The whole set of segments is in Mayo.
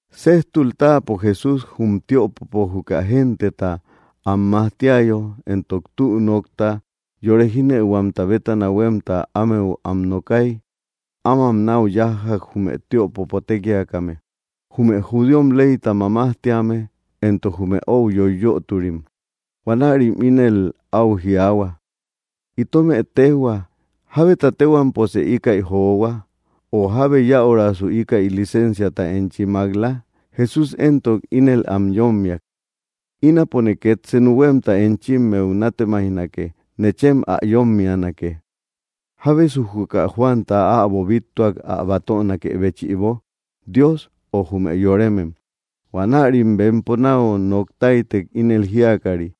Séjtul táapo Jesús jum tiöpopo juka genteta am majtiayo entok tü nokta yore jínëuhuamta bétana huémta ámeu am nookay, ámam náu yájjak jume tiöpopo tékiakame, jume judíom leyta mamajtíame, éntok jume ou yoiyöturim. Huanärim ínel áu jiaahua: —Itomë téjhua, ¿jábeta téhuamposë íkäi johua? O, ¿jábe yäurasu íkäi licensiata enchi mák‑la? Jesús éntok ínel am yómmiak: —Ínapone két senu huémta enchimmeu nátemaijnake. Nechem ä yómmianake: ¿jábesu juka Juanta äbo bíttuak ä batönakë béchïbo? ¿Dios, o jume yoremem? Huanärim bempo náu nok táytek, ínel jíakari: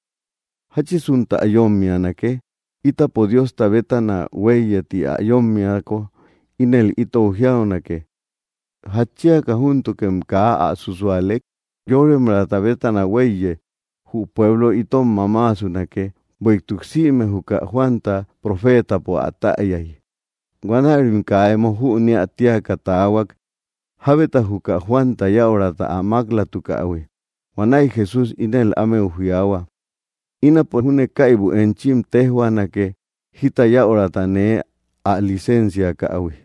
—¿Jáchinsutä yómmianake? Ítapo Diosta bétana huéiye ti ä yómmiako, ínel itou jiaunake: “¿Jatchiaka júntukem kaa ä súsualek?” Yóremraata bétana huéiye, jü pueblo itom mamaasunake; bueïtuk sïme juka Juanta profeetapo ä täyay. Huanärim kaa emo jüneä tíaka taahuak, jábeta juka Juanta yäurata ä mák‑latukähui. Huanäi Jesús ínel ámeu jiaahua: —Ínapo júne kaibu enchim téjhuaanake jita yäurata nee ä licensiakähui.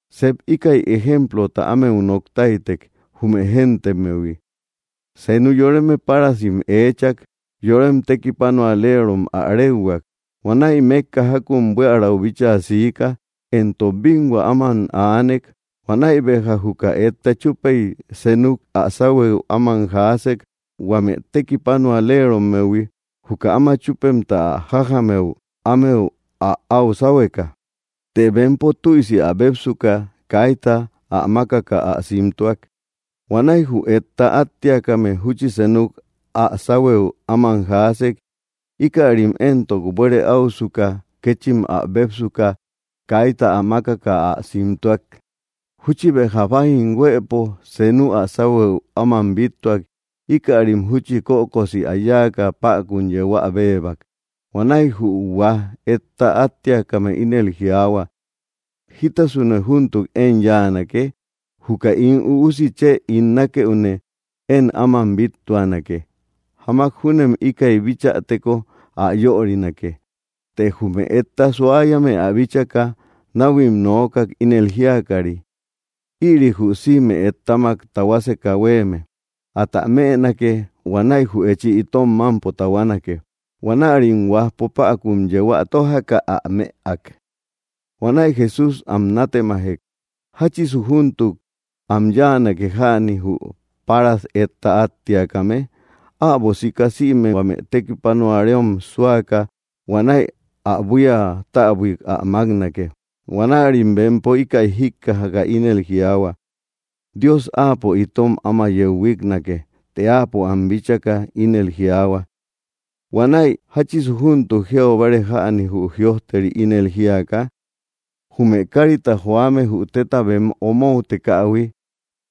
Sep íkäi ejemplota ámeu nok táytek jume géntemmehui: —Senu yoreme párasim eechak, yorem tekipanualerom ä réuhuak. Huanäi mékka jákun buiärau bíchaa siika éntok bínhua áman aanek. Huanäi béja juka etta chúpey, senuk ä sáhuëu áman jaasek huame tekipanualerommehui, juka áma chúpemta ä jájamëu ámeu ä au sáhueka. Të bempo tüisi ä bépsuka, kaita ä mákaka ä simtuak. Huanäi jü etta áttiakame júchi senuk ä sáhuëu áman jaasek. Íkärim éntok, buere áusuka kéchim ä bépsuka, kaita ä mákaka ä simtuak. Júchi béja bájim huëpo senu ä sáhuëu áman bíttuak; íkärim júchi kökosi ä yáaka päkun yeu ä béebak. ’Huanäi jü huaj etta áttiakame ínel jiaahua: ‘‘¿Jítasune júntuk én yáanake? Juka ín üusi chë ín nákëune én áman bíttuanake; jamak júnem íkäi bichäteko ä yörinake.” Të jume etta suayame ä bíchaka, náhuim nookak, ínel jíakari: ‘‘Ïri jü sïme ettamak tahuaseka huéeme. Atä mënake. Huanäi jü echi itom mámpo tahuanake.” Huanärim huajpo päkun yeu ä tójaka, ä mëak. Huanäi Jesús am natemajek: —¿Jáchisu júntuk am yáanake jäni, jü páras etta áttiakame? Äbo sika sïme huame tekipanuareom súaka, huanäi ä buía täbuik ä máknake. Huanärim bempo íkäi jíkkajaka, ínel jiaahua: —¡Dios áapo itom áma yeu huíknake! Të áapo am bíchaka, ínel jiaahua: —Huanäi ¿jáchisu júntuk jiau báare jäni jü jïojteri? Ínel jiaka: Jume kárita joame jü téta bem omoutekähui,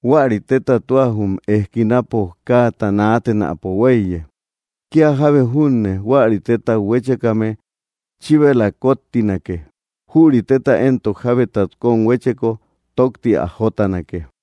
huäri téta tua jum ejkinapo káata naatenäpo huéiye. Kía jábe júne huäri tétat huéchekame, chíbela kóttinake; jüri téta éntok jábetat kóm huécheko, tókti ä jótanake.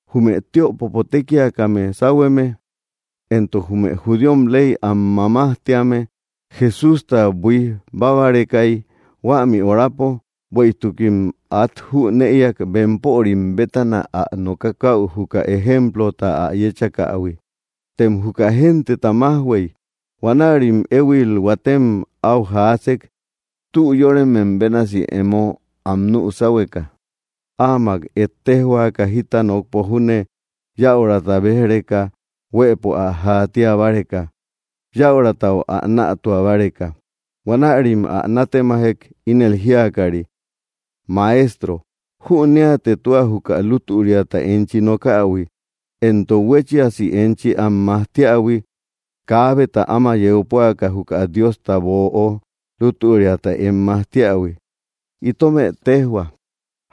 Jume tiöpopo tékiakame sáhueme, éntok jume judíom ley am mamajtíame Jesústa buíj bábarekay huämi horapo, bueïtukim át jünëiak bempörim bétana ä nokakäu juka ejemplota ä yéchakähui. Tem juka genteta májhuey. Huanärim éhuil huatem áu jaasek, tü yóremem bénasi emo am nü sáhueka, áamak ejtejhuaka jita nokpo júne yäurata béj‑reka huëpo ä jaatia báreka, yäuratau ä nätua báreka. Huanärim ä nátemajek, ínel jíakari: —Maestro, jüneate tua juka lútüriata enchi nokähui, éntok huéchiasi enchi am majtiähui, kaabeta áma yeu púaka juka Diosta böo lútüria em majtiähui. Itome tejhua: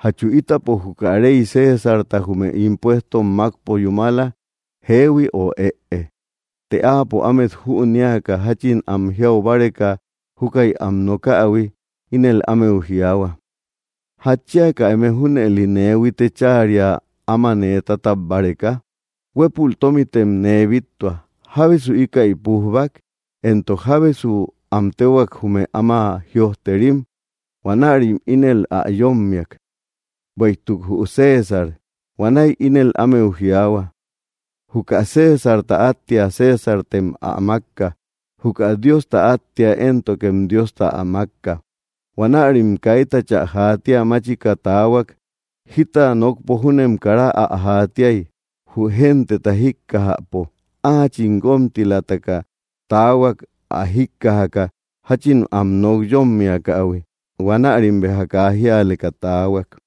¿jachu ítapo juka rey Césarta jume impuestom mákpo yúmala, jehui o ëe? Të áapo, ámet jünéaka jáchin am jiau báreka júkäi am nokähui, ínel ámeu jiaahua: —¿Jatchiaka eme junëli nee huite cháaria áma nee tátab báreka? Huépul tómitem nee bíttua. ¿Jábesu íkäi pújbak, éntok jábesu am téhuak jume áma jïojterim? Huanärim ínel ä yómmiak: —Bueïtuk jü César. Huanäi ínel ámeu jiaahua: —Juka Césarta áttia Césartem ä mákka; juka Diosta áttia éntokem Diosta ä mákka. Huanärim kaitachä jaatia máchika taahuak, jita nokpo júnem kara ä jaatiay, jü genteta jíkkajäpo. Áachim guómtilataka taahuak, ä jíkkajaka jáchin am nok yómmiakähui. Huanärim kaa jíaleka taahuak.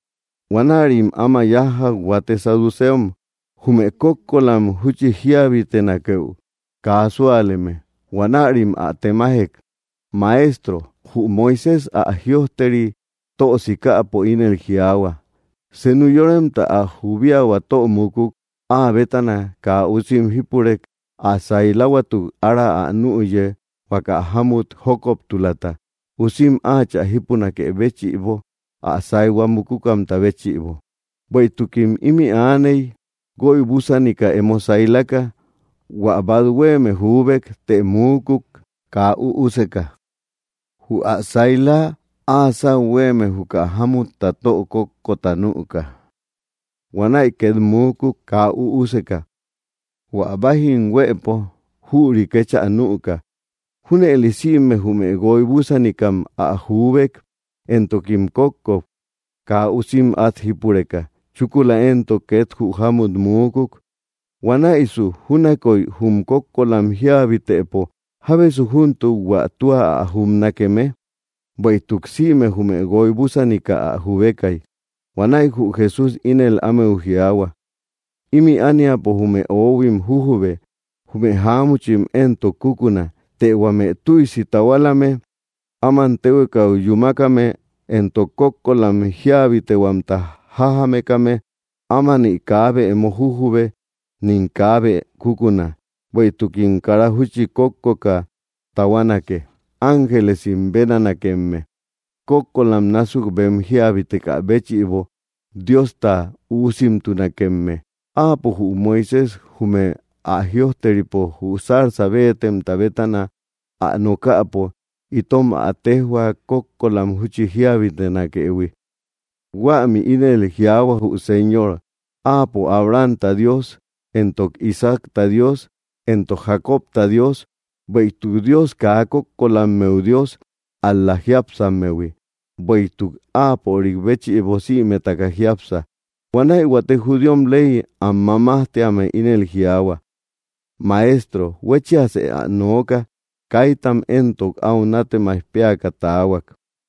Huanärim áma yájjak huate saduceom, jume kókkolam júchi jíabitenakeu kaa súaleme. Huanärim ä temajek: —Maestro, jü Moisés ä jïojteri tö sikäpo ínel jiaahua: Senu yoremta ä jubiahua tö mukuk áa bétana kaa usim jípurek, ä sailahuatuk ára ä nüye huaka jámut jókoptulata, usim áachä jípunakë béchïbo ä saihua mukukamta béchïbo. Bueïtukim ímï aaney, guoy búsanika emo sailaka. Huä bát huéeme juubek; të muukuk, kaa üuseka. Jü ä saila áa sáu huéeme juka jámutta tö kókkota nüka. Huanäi két muukuk, kaa üuseka. Huä bájim huëpo jüri kéchä nüka. Júnëli sïme jume guoy búsanikam ä juubek, éntokim kókkok, kaa usim át jípureka. Chúkula éntok két jü jámut muukuk. Huanäisu júnakoy jum kókkolam jíabitëpo, ¿jábesu júntuk hua tua ä jubnakeme? Bueïtuk sïme jume guoy búsanika ä jubekay. Huanäi jü Jesús ínel ámeu jiaahua: —Ímï ániapo jume óhuim jujube; jume jáamuchim éntok kukuna. Të huame tüisi tahualame, áman téhuekau yúmakame éntok kókkolam jíabitehuamta jájamekame, ámani kaabe emo jujube, nim kaabe kukuna, bueïtukim kara júchi kókkoka tahuanake; ángelesim bénanakemme. Kókkolam násuk bem jíabitekä béchïbo, Diosta üusimtunakemme. Áapo, jü Moisés junne, jum ä jïojteripo jü zarza béetemta bétana ä nokäpo, itom ä téjhua kókkolam júchi jiabitenakëhui. Huämi ínel jiaahua: Jü Señor Áapo Abrahamta Dios, entok Isaacta Dios, éntok Jacobta Dios. Bueïtuk Dios kaa kókkolammeu Dios, ál‑la jiápsammehui; bueïtuk áapörik béchïbo sïmetaka jiápsa. Huanäi huate judíom ley am mamajtíame ínel jiaahua: —Maestro, huéchiasë ä nookak. Kaitam éntok áu nátemaij péaka taahuak.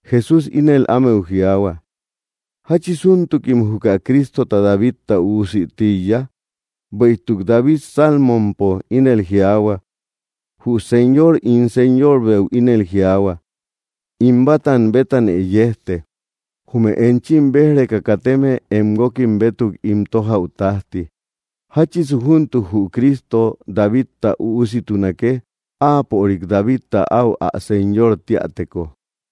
Jesús ínel ámeu jiaahua: —¿Jáchisuntukim juka Cristota Davidta üusï tíiya? Bueïtuk David Salmompo ínel jiaahua: Jü Señor ín Señorbeu ínel jiaahua: “In bátam bétanë yejte, jume enchi béj‑reka kateme em guókim bétuk ín tójäu tájti.” ¿Jáchisu júntuk jü Cristo Davidta üussitunake, áapörik Davidta áu ä Señor tíäteko?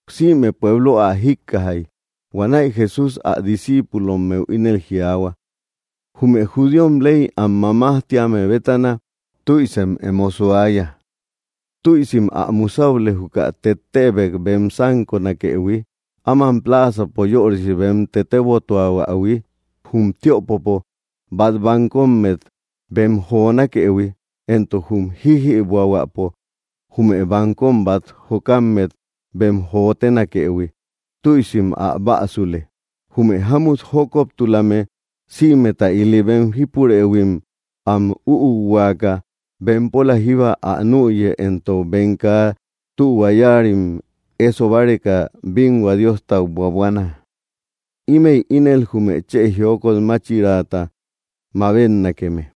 Sïme Pueblo ä jíkkajay, huanäi Jesús ä discíipulommeu ínel jiaahua: —Jume judíom ley am mamajtíame bétana, tüisem emo suaya. Tüisim ä musäule juka tettebek bem sánkonakëhui, áman pláazapo yörisi bem tetebotuahuähui, jum tiöpopo bát bankommet bem jonakëhui, éntok jum jíjïbuähuäpo jume bankom bát jokammet bem jotenakëhui; tüisim ä bäsule. Jume jámut jókoptulame sïmeta ili bem jípurëhuim am üuhuaka, bempola jíba ä nüye, éntok bem kaa tühua yáarim éso báreka bínhua Diostau buabuana. Ímëi ínel jume chë jiokot máchiraata mabetnakeme.